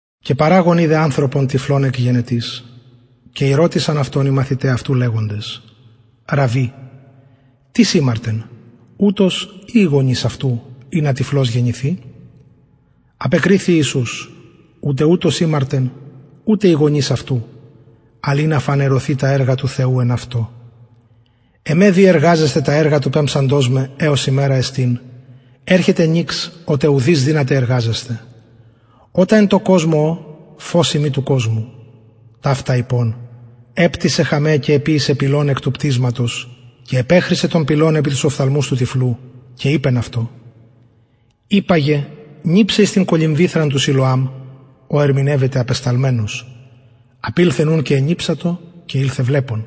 και παραγων ειδεν ανθρωπον τυφλον εκ γενετης και ηρωτησαν αυτον οι μαθηται αυτου λεγοντες ραββι τις ημαρτεν ουτος η οι γονεις αυτου ινα τυφλος γεννηθη απεκριθη ιησους ουτε ουτος ημαρτεν ουτε οι γονεις αυτου αλλ ινα φανερωθη τα εργα του θεου εν αυτω εμε δει εργαζεσθαι τα εργα του πεμψαντος με εως ημερα εστιν ερχεται νυξ οτε ουδεις δυναται εργαζεσθαι οταν εν τω κοσμω ω φως ειμι του κοσμου ταυτα ειπων επτυσεν χαμαι και εποιησεν πηλον εκ του πτυσματος και επεχρισεν τον πηλον επι τους οφθαλμους του τυφλου και ειπεν αυτω υπαγε νιψαι εις την κολυμβηθραν του σιλωαμ ο ερμηνευεται απεσταλμενος απηλθεν ουν και ενιψατο και ηλθεν βλεπων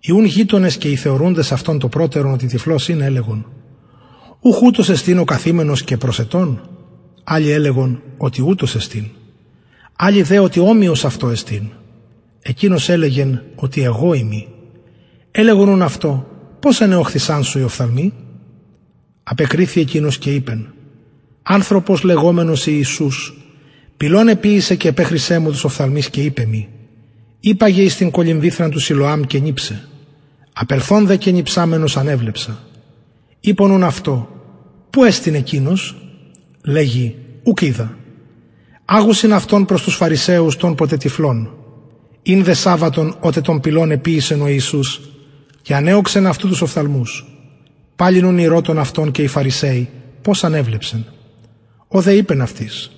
οι ουν γειτονες και οι θεωρουντες αυτον το προτερον οτι τυφλος ην ελεγον ουχ ουτος εστιν ο καθημενος και προσαιτων αλλοι ελεγον οτι ουτος εστιν αλλοι δε οτι ομοιος αυτω εστιν εκεινος ελεγεν οτι εγω ειμι ελεγον ουν αυτω πως ανεωχθησαν σου οι οφθαλμοι απεκριθη εκεινος και ειπεν ανθρωπος λεγομενος ιησους πηλον εποιησεν και επεχρισεν μου τους οφθαλμους και ειπεν μοι υπαγε εις την κολυμβηθραν του σιλωαμ και νιψαι απελθων δε και νιψαμενος ανεβλεψα ειπον ουν αυτω που εστιν εκεινος λεγει ουκ οιδα αγουσιν αυτον προς τους φαρισαιους τον ποτε τυφλον ην δε σαββατον οτε τον πηλον εποιησεν ο ιησους και ανεωξεν αυτου τους οφθαλμους παλιν ουν ηρωτων αυτον και οι φαρισαιοι πως ανεβλεψεν ο δε ειπεν αυτοις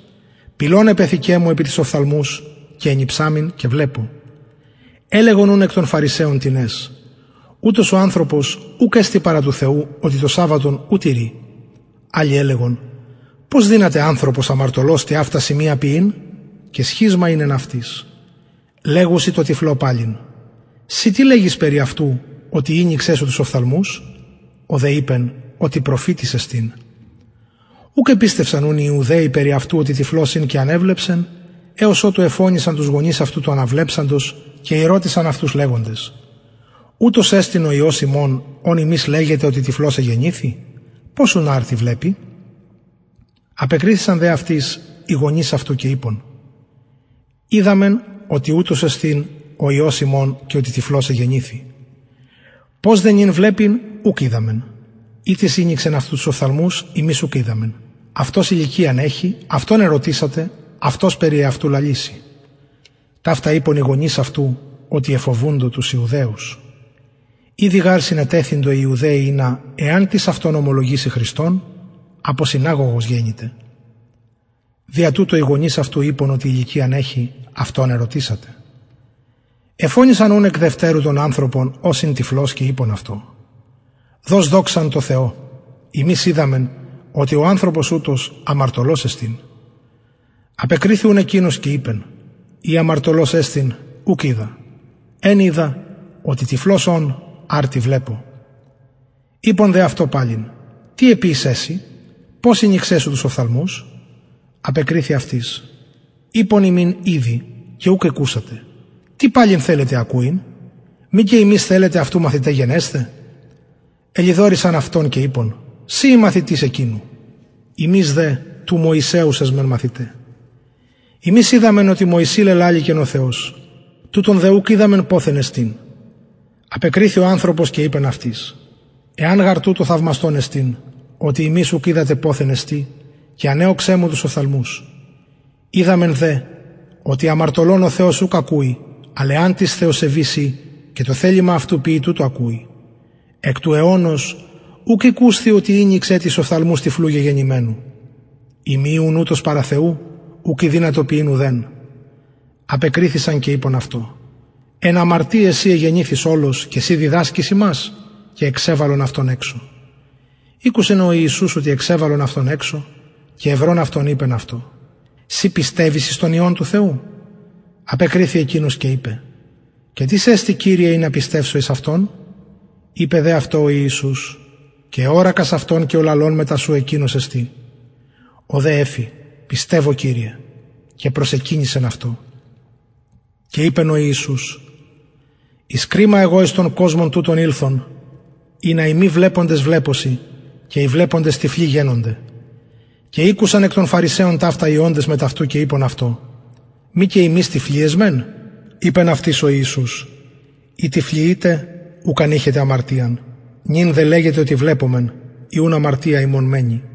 πηλον επεθηκεν μου επι τους οφθαλμους και ενιψαμην και βλεπω ελεγον ουν εκ των φαρισαιων τινες ουτος ο ανθρωπος ουκ εστιν παρα του θεου οτι το σαββατον ου τηρει αλλοι ελεγον πως δυναται ανθρωπος αμαρτωλος τοιαυτα σημεια ποιειν και σχισμα ην εν αυτοις λεγουσιν τω τυφλω παλιν συ τι λεγεις περι αυτου οτι ηνοιξεν σου τους οφθαλμους ο δε ειπεν οτι προφητης εστιν ουκ επιστευσαν ουν οι ιουδαιοι περι αυτου οτι τυφλος ην και ανεβλεψεν εως οτου εφωνησαν τους γονεις αυτου του αναβλεψαντος και ηρωτησαν αυτους λεγοντες ουτος εστιν ο υιος υμων ον υμεις λεγετε οτι τυφλος εγεννηθη πως ουν αρτι βλεπει απεκριθησαν δε αυτοις οι γονεις αυτου και ειπον οιδαμεν οτι ουτος εστιν ο υιος ημων και οτι τυφλος εγεννηθη πως δε νυν βλεπει ουκ οιδαμεν η τις ηνοιξεν αυτου τους οφθαλμους ημεις ουκ οιδαμεν αυτος ηλικιαν εχει αυτον ερωτησατε αυτος περι εαυτου λαλησει ταυτα ειπον οι γονεις αυτου οτι εφοβουντο τους ιουδαιους ηδη γαρ συνετεθειντο οι ιουδαιοι ινα εαν τις αυτον ομολογηση χριστον αποσυναγωγος γενηται δια τουτο οι γονεις αυτου ειπον οτι ηλικιαν εχει αυτον ερωτησατε εφωνησαν ουν εκ δευτερου τον ανθρωπον ος ην τυφλος και ειπον αυτω δος δοξαν τω θεω ημεις οιδαμεν οτι ο ανθρωπος ουτος αμαρτωλος εστιν απεκριθη ουν εκεινος και ειπεν ει αμαρτωλος εστιν ουκ οιδα εν οιδα οτι τυφλος ων αρτι βλεπω ειπον δε αυτω παλιν τι εποιησεν σοι πως ηνοιξεν σου τους οφθαλμους απεκριθη αυτοις ειπον υμιν ηδη και ουκ ηκουσατε τι παλιν θελετε ακουειν μη και υμεις θελετε αυτου μαθηται γενεσθαι ελοιδορησαν αυτον και ειπον συ ει μαθητης εκεινου ημεις δε του μωσεως εσμεν μαθηται ημεις οιδαμεν οτι μωση λελαληκεν ο θεος τουτον δε ουκ οιδαμεν ποθεν εστιν απεκριθη ο ανθρωπος και ειπεν αυτοις εν γαρ τουτω θαυμαστον εστιν οτι υμεις ουκ οιδατε ποθεν εστιν και ανεωξεν μου τους οφθαλμους οιδαμεν δε οτι αμαρτωλων ο θεος ουκ ακουει αλλ εαν τις θεοσεβης η και το θελημα αυτου ποιη τουτου ακουει εκ του αιωνος ουκ ηκουσθη οτι ηνοιξεν τις οφθαλμους τυφλου γεγεννημενου ει μη ην ουτος παρα θεου ουκ ηδυνατο ποιειν ουδεν απεκριθησαν και ειπον αυτω εν αμαρτιαις συ εγεννηθης ολος και συ διδασκεις ημας και εξεβαλον αυτον εξω ηκουσεν ο ιησους οτι εξεβαλον αυτον εξω και ευρων αυτον ειπεν αυτω συ πιστευεις εις τον υιον του θεου απεκριθη εκεινος και ειπεν και τις εστιν κυριε ινα πιστευσω εις αυτον ειπεν δε αυτω ο ιησους και εωρακας αυτον και ο λαλων μετα σου εκεινος εστιν ο δε εφη πιστευω κυριε και προσεκυνησεν αυτω και ειπεν ο ιησους εις κριμα εγω εις τον κοσμον τουτον ηλθον ινα οι μη βλεποντες βλεπωσιν και οι βλεποντες τυφλοι γενωνται και ηκουσαν εκ των φαρισαιων ταυτα οι οντες μετ αυτου και ειπον αυτω μη και ημεις τυφλοι εσμεν ειπεν αυτοις ο ιησους ει τυφλοι ητε ουκ αν ειχετε αμαρτιαν νυν δε λεγετε οτι βλεπομεν η ουν αμαρτια υμων μενει